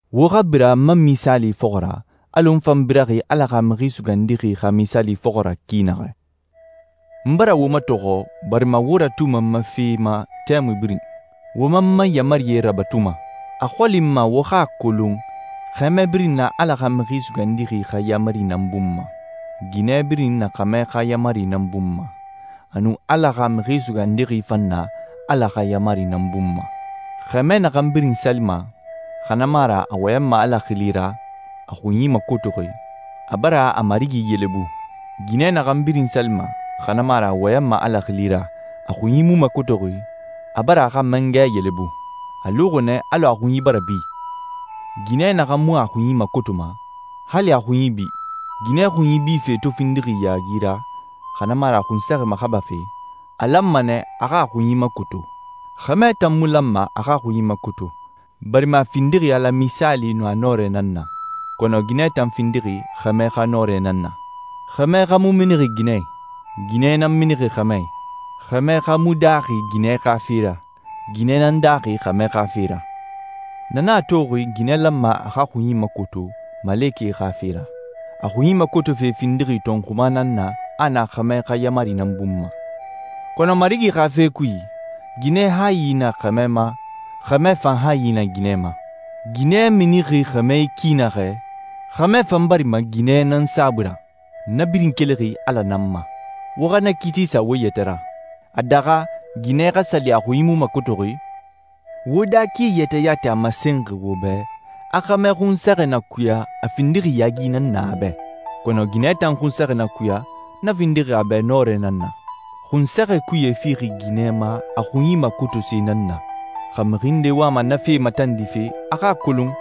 Wo xa bira n ma misaali fɔxɔ ra, alɔ n fan biraxi Ala xa Mixi Sugandixi xa misaali fɔxɔ ra ki naxɛ. N bara wo matɔxɔ barima wo ratuma n ma fe ma tɛmui birin, wo man n ma yaamarie rabatuma. A xɔli n ma wo xa a kolon xɛmɛ birin na Ala xa Mixi Sugandixi xa yaamari nan bun ma, ginɛ birin na xɛmɛ xa yaamari nan bun ma, a nun Ala xa Mixi Sugandixi fan na Ala xa yaamari nan bun ma. Xɛmɛ naxan birin salima, xa na mu a ra a wɔyɛnma Ala xili ra, a xunyi makotoxi, a bara a Marigi yelebu. Ginɛ naxan birin salima, xa na mu a ra a wɔyɛnma Ala xili ra, a xunyi mu makotoxi, a bara a xa mangɛ yelebu. A luxi nɛ alɔ a xunyi bara bi. Ginɛ naxan mu a xunyi makotoma, hali a xunyi bi. Ginɛ xunyi bife to findixi yaagi ra, xa na mu a ra a xunsɛxɛ maxabafe, a lanma nɛ a xa a xunyi makoto. Xɛmɛ tan mu lanma a xa a xunyi makoto, barima a findixi Ala misaali nun a nɔrɛ nan na, kɔnɔ ginɛ tan findixi xɛmɛ xa nɔrɛ nan na. Xɛmɛ xa mu minixi ginɛ i. Ginɛ nan minixi xɛmɛ i. Xɛmɛ xa mu daaxi ginɛ xa fe ra. Ginɛ nan daaxi xɛmɛ xa fe ra. Na nan a toxi ginɛ lanma a xa a xunyi makoto malekɛe xa fe ra. A xunyi makotofe findixi tɔnxuma nan na a a na xɛmɛ xa yaamari nan bun ma. Kɔnɔ Marigi xa fe kui, ginɛ hayi na xɛmɛ ma, xɛmɛ fan hayi na ginɛ ma. Ginɛ minixi xɛmɛ i ki naxɛ, xɛmɛ fan barima ginɛ nan saabui ra. Na birin kelixi Ala nan ma. Wo xa na kiiti sa wo yɛtɛ ra. A daxa ginɛ xa sali a xunyi mu makotoxi? Wo daa ki yɛtɛ yati a masenxi wo bɛ a xɛmɛ xunsɛxɛ na kuya a findixi yaagi nan na a bɛ, kɔnɔ ginɛ tan xunsɛxɛ na kuya, na findixi a bɛ nɔrɛ nan na. Xunsɛxɛ kuye fixi ginɛ ma a xunyi makotose nan na. Xa mixi nde wama na fe matandife, a xa a kolon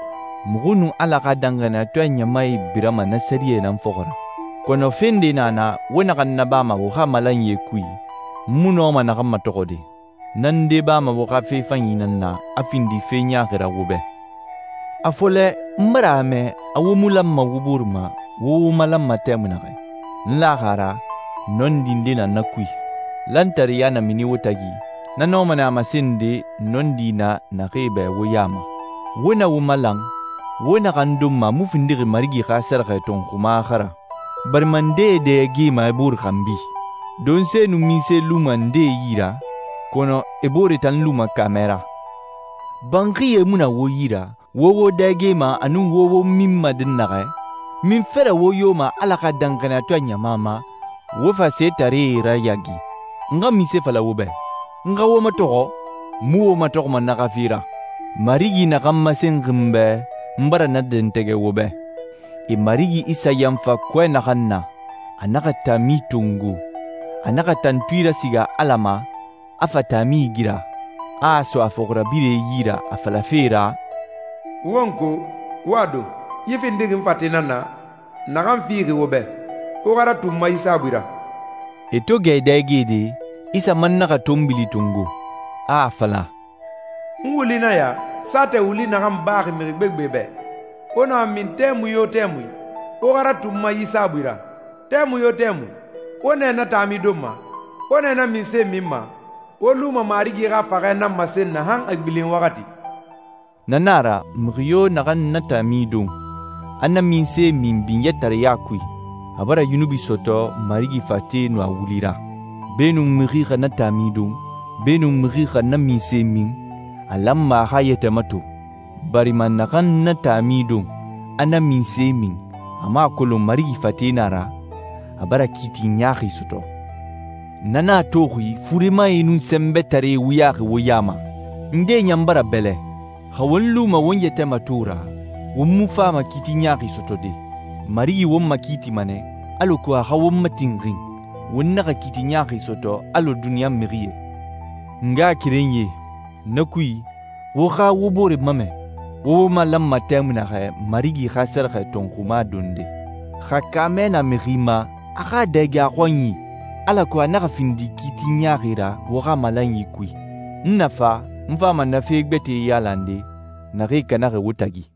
muxu nun Ala xa danxaniyatɔɛ ɲamae birama na sɛriyɛ nan fɔxɔ ra. Kɔnɔ fe nde na na wo naxan nabama wo xa malanyie kui, n mu nɔma naxan matɔxɔde. Na nde bama wo xa fe fanyi nan na, a findi fe ɲaaxi ra wo bɛ. A fɔlɛ, n bara a mɛ a wo mu lanma wo bore ma wo wo malanma tɛmui naxɛ. N laxi a ra nɔndi nde na na kui. Lantareya na mini wo tagi, na nɔma nɛ a masende nɔndi na naxee bɛ wo ya ma. Wo na wo malan, wo naxan donma a mu findixi Marigi xa sɛrɛxɛ tɔnxuma xa ra, barima ndee e dɛgema e booree xanbi. Donse nun minse luma ndee yi ra, kɔnɔ e booree tan luma kaamɛ ra. Banxie mu na wo yi ra wo wo dɛgema a nun wo wo minma dɛnnaxɛ? Munfe ra wo yoma Ala xa danxaniyatɔɛ ɲama ma, wo fa setaree rayaagi? N xa munse fala wo bɛ? N xa wo matɔxɔ? N mu wo matɔxɔma na xa fe ra. Marigi naxan masenxi n bɛ, n bara na dɛntɛgɛ wo bɛ. E Marigi Isa yanfa kɔɛ naxan na, a naxa taami tongo, a naxa tantui rasiga Ala ma, a fa taami igira, a a so a fɔxirabirɛe yi ra a falafe ra, «Wo n ko, wo a don. Yi findixi n fate nan na, naxan fixi wo bɛ. Wo xa ratu n ma yi saabui ra.» E to gɛ e dɛgede, Isa man naxa tɔnbili tongo, a a fala, «N wuli nan ya, saatɛ wuli naxan baxi mixi gbegbe bɛ. Wo na a min tɛmui yo tɛmui, wo xa ratu n ma yi saabui ra. Tɛmui yo tɛmui, wo nɛ na taami donma, wo nɛ na minse minma, wo luma Marigi xa faxɛ nan masen na han a gbilen waxati.» Na na a ra, mixi yo naxan na taami don, a na minse min binyɛtareɲa kui, a bara yunubi sɔtɔ Marigi fate nun a wuli ra. Beenun mixi xa na taami don, beenun mixi xa na minse min, a lanma a xa a yɛtɛ mato, barima naxan na taami don, a na minse min, a mu a kolon Marigi fate nan a ra, a bara kiiti ɲaaxi sɔtɔ. Na nan a toxi furemae nun sɛnbɛtaree wuyaxi wo ya ma. Ndee ɲan bara bɛlɛ. Xa won luma won yɛtɛ mato ra, won mu fama kiiti ɲaaxi sɔtɔde. Marigi won makiitima nɛ, alako a xa won matinxin, won naxa kiiti ɲaaxi sɔtɔ alɔ duniɲa mixie. N ngaxakerenyie, na kui, wo xa wo bore mamɛ, wo wo malanma tɛmui naxɛ Marigi xa sɛrɛxɛ tɔnxuma donde. Xa kaamɛ na mixi ma, a xa a dɛge a xɔnyi, alako a naxa findi kiiti ɲaaxi ra wo xa malanyi kui. N na fa, n fama na fe gbɛtɛe yailande naxee kanaxi wo tagi.